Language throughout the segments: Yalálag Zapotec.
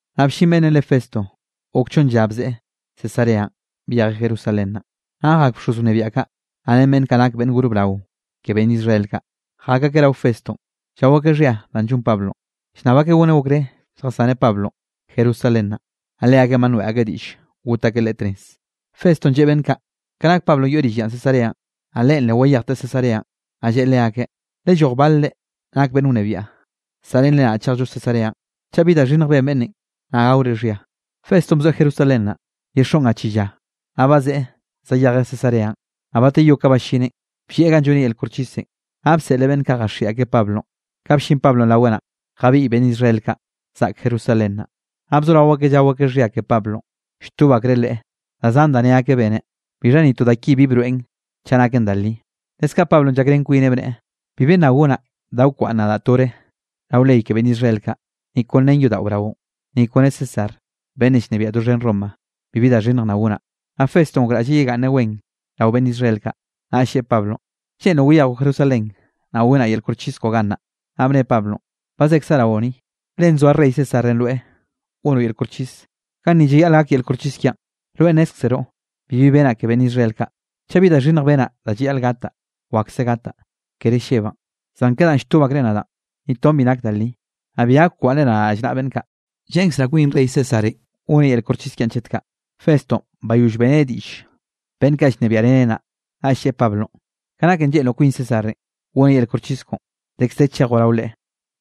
Naꞌ bllin beꞌnnenꞌ re Festo, gok chonn lla bzeꞌe Cesareanꞌ byejeꞌ Jerusalén naꞌ. Naꞌ jak bxoz wnebiaꞌ kaꞌ, naꞌ ren beꞌnn kaꞌ nak beꞌnn gor brao ke beꞌnn Israel kaꞌ, jak akeꞌ rao Festonꞌ llao akeꞌ xhia danꞌ llon Pablonꞌ. Llnnab akeꞌ goneꞌ okré lljasaneꞌ Pablonꞌ Jerusalén naꞌ. Naꞌ leakeꞌn ba noeꞌ akeꞌ diꞌll got akeꞌ leꞌe tnez. Festonꞌ lleꞌe beꞌnn kaꞌ ka nak Pablonꞌ yoeꞌ rill ya Cesareanꞌ, naꞌ leꞌen le wayejteꞌ Cesareanꞌ, naꞌ lleꞌe leakeꞌ: —Lelloj balre nak beꞌnn wnebiaꞌ, saꞌrenre nadaꞌ chejllo Cesareanꞌ, chaꞌ bi da xhinnj ben beꞌnnenꞌ naꞌ gaore xhia. Festonꞌ bzoeꞌ Jerusalén naꞌ, ye xoꞌn ga chi lla, naꞌll bazeꞌe zayejeꞌ Cesareanꞌ. Naꞌ bateyó ka ballineꞌn, bllieꞌ ganꞌ lloneꞌ yel koxchisenꞌ, naꞌ bseꞌleꞌ beꞌnn kaꞌ jaxiꞌi akeꞌ Pablonꞌ. Ka bllin Pablonꞌ raweꞌn naꞌ, jabiꞌy beꞌnn Israel kaꞌ zaꞌk Jerusalén. Naꞌ bzorao akeꞌ llao akeꞌ xhia ke Pablonꞌ, lltob akreꞌ leꞌe da zan da ne akeꞌ beneꞌ, bixha ni to da ki bi broeꞌn chaꞌ naken da li. Leskaꞌ Pablonꞌ llakrén kwineꞌ, bneꞌe: —Bibi nna gonaꞌ da wkwaꞌnn nadaꞌ tore rao ley ke beꞌnn Israel kaꞌ, ni kon ren yodaꞌo braonꞌ, ni kone César beꞌnnenꞌ llnebiaꞌ doxhen Roma bibi da xhinnj nna gonaꞌ. Naꞌ Festonꞌ gokraꞌlleꞌ yegaꞌnneꞌ wen rao beꞌnn Israel kaꞌ, naꞌll lleꞌe Pablonꞌ: —¿Lleꞌnroꞌ wayejoꞌ Jerusalén naꞌ gonaꞌ yel koxchis koꞌo gannaꞌ? Naꞌ bne Pablonꞌ: —Ba zekzaꞌ raoꞌ ni, le nzoa rey Césarenꞌ rweꞌ gonoꞌ yel koxchis, ganni llayaꞌl gak yel koxchis kiaꞌn. Rweꞌ nnézkzeroꞌ, bibi benaꞌ ke beꞌnn Israel kaꞌ. Chaꞌ bi da xhinnj benaꞌ da llayaꞌl gataꞌ, wakse gataꞌ, kere llebaꞌn. Zan ke danꞌ lltob akreꞌ nadaꞌn, ni ton bi nak da li, naꞌ bi gak kwaꞌnnre nadaꞌ rallnaꞌa beꞌnn kaꞌ. Lleꞌnkzraꞌ kwin rey Césarenꞌ goneꞌ yel koxchis kiaꞌn chet kaꞌ. Festonꞌ, bayoll beꞌreneꞌ diꞌll beꞌnn kaꞌ llnebiaꞌreneꞌ naꞌ, naꞌll lleꞌe Pablonꞌ: —Ka naken lleꞌnroꞌ kwin Césarenꞌ goneꞌ yel koxchis koꞌon, dekz de chejoꞌ rao leꞌe.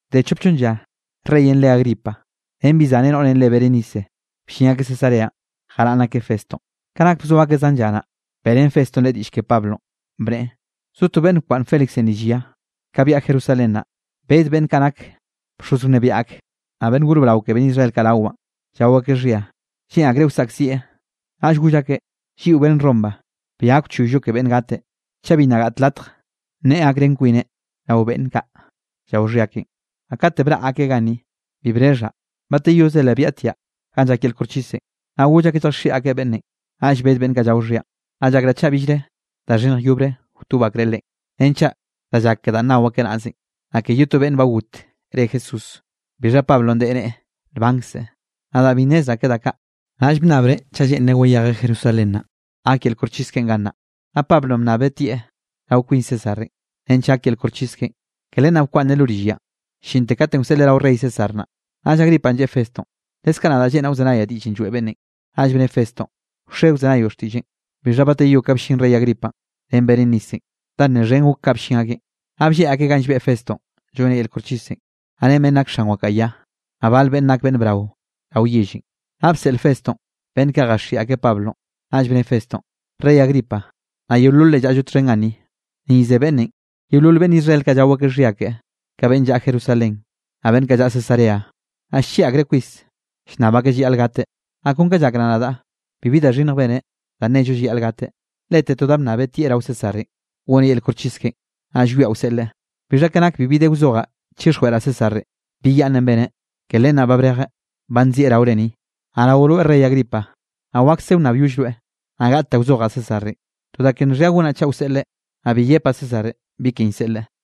Bde chop chonn lla, reyenꞌ re Agripa ren bi zaneꞌ noꞌrenꞌ re Berenice, bllin akeꞌ Cesareanꞌ jaraꞌnn akeꞌ Festonꞌ. Ka nak bzo akeꞌ zan lla naꞌ, beꞌrén Festonꞌ leꞌe diꞌll ke Pablonꞌ, bneꞌe: —Zo to beꞌnn bkwaꞌnn Félixenꞌ rill ya. Ka byaꞌa Jerusalén naꞌ, bed beꞌnn kaꞌ nak bxoz wnebiaꞌ ak, naꞌ beꞌnn gor brao ke beꞌnn Israel kaꞌ rawaꞌn, llao akeꞌ xhia, lleꞌn akreꞌ wsaꞌkzieꞌ. Naꞌll goll akeꞌ, lliꞌo beꞌnn Roma bi gak wchoyllo ke beꞌnne gateꞌ, chaꞌ bi nna gaꞌt latj nneꞌe gakrén kwineꞌ rao beꞌnn kaꞌ llao xhia keꞌen. Naꞌ kate braꞌ akeꞌ ganni, bi brexhaꞌ; bateyoze le byaꞌtiaꞌ ganꞌ llak yel koxchisenꞌ, naꞌ goll akeꞌ lljaxhiꞌi akeꞌ beꞌnnenꞌ. Naꞌll bed beꞌnn kaꞌ llao xhianꞌ, naꞌ llakraꞌ chaꞌ billre da xhinnj yobre wtob akreꞌ leꞌen. Renchaꞌ da llak ke danꞌ nao akeꞌ naꞌzenꞌ, naꞌ ke ye to beꞌnn ba got re Jesús, bixha Pablonꞌ deꞌe neꞌe nbankzeꞌ. Nadaꞌ bi nnezraꞌ ke da kaꞌ, naꞌll bnnabreꞌ chaꞌ lleꞌnreꞌ wayejeꞌ Jerusalén naꞌ, gak yel koxchis keꞌen gannaꞌ. Naꞌ Pablonꞌ bnnabeꞌ tieꞌ rao kwin Césarenꞌ, nench gak yel koxchis keꞌen. Ke len naꞌ bkwaꞌnneꞌ lo rill yanꞌ, llinte katenꞌ wseꞌleꞌ rao rey César naꞌ. Naꞌll Agripanꞌ lleꞌe Festonꞌ: —Leskaꞌ nadaꞌ lleꞌnraꞌ wzenayaꞌ diꞌllenꞌ lloeꞌ beꞌnnenꞌ. Naꞌll bne Festonꞌ: —Wxe wzenayoꞌ xtiꞌlleꞌn. Bixha bateyó ka bllin rey Agripanꞌ ren Berenicenꞌ, da nne xhen gok ka bllin akeꞌn, naꞌ blleꞌ akeꞌ ganꞌ llbeꞌ Festonꞌ lloneꞌ yel koxchisenꞌ, naꞌ ren beꞌnn nak xan wakaꞌa ya, naꞌ bal beꞌnn nak beꞌnn brao rao yellenꞌ. Naꞌ bseꞌl Festonꞌ beꞌnn kaꞌ jaxhiꞌi akeꞌ Pablonꞌ. Naꞌll bne Festonꞌ: —Rey Agripa, naꞌ yeololre llaꞌllo txhen ganni, ni ze beꞌnnenꞌ, yeolol beꞌnn Israel kaꞌ llao akeꞌ xhia keꞌe, ka beꞌnn llaꞌa Jerusalén, naꞌll beꞌnn kaꞌ llaꞌa Cesarea, naꞌ llchieꞌ akreꞌ kwis, llnnab akeꞌ llayaꞌl gateꞌ. Naꞌ kon kaꞌ llakraꞌ nadaꞌ, bibi da xhinnj beneꞌ da nnello llayaꞌl gateꞌ. Lete to da bnnabeꞌ tieꞌ rao Césarenꞌ goneꞌ yel koxchis keꞌen. Naꞌ llwiaꞌ wseꞌleꞌ. Bixha ka nak bibi de wzojaꞌ chixjweꞌraꞌ Césarenꞌ bi yaꞌnnenꞌ beneꞌ; ke len ba brejeꞌ, ba nzieꞌ raore ni, naꞌ rao rweꞌ rey Agripa, naꞌ wakse wnnabyoll rweꞌ, naꞌ gaꞌt da wzojaꞌ Césarenꞌ. To da ke nxhia gonaꞌ chaꞌ wseꞌleꞌ, naꞌ bi yepaꞌ Césarenꞌ bi ken llseꞌleꞌ.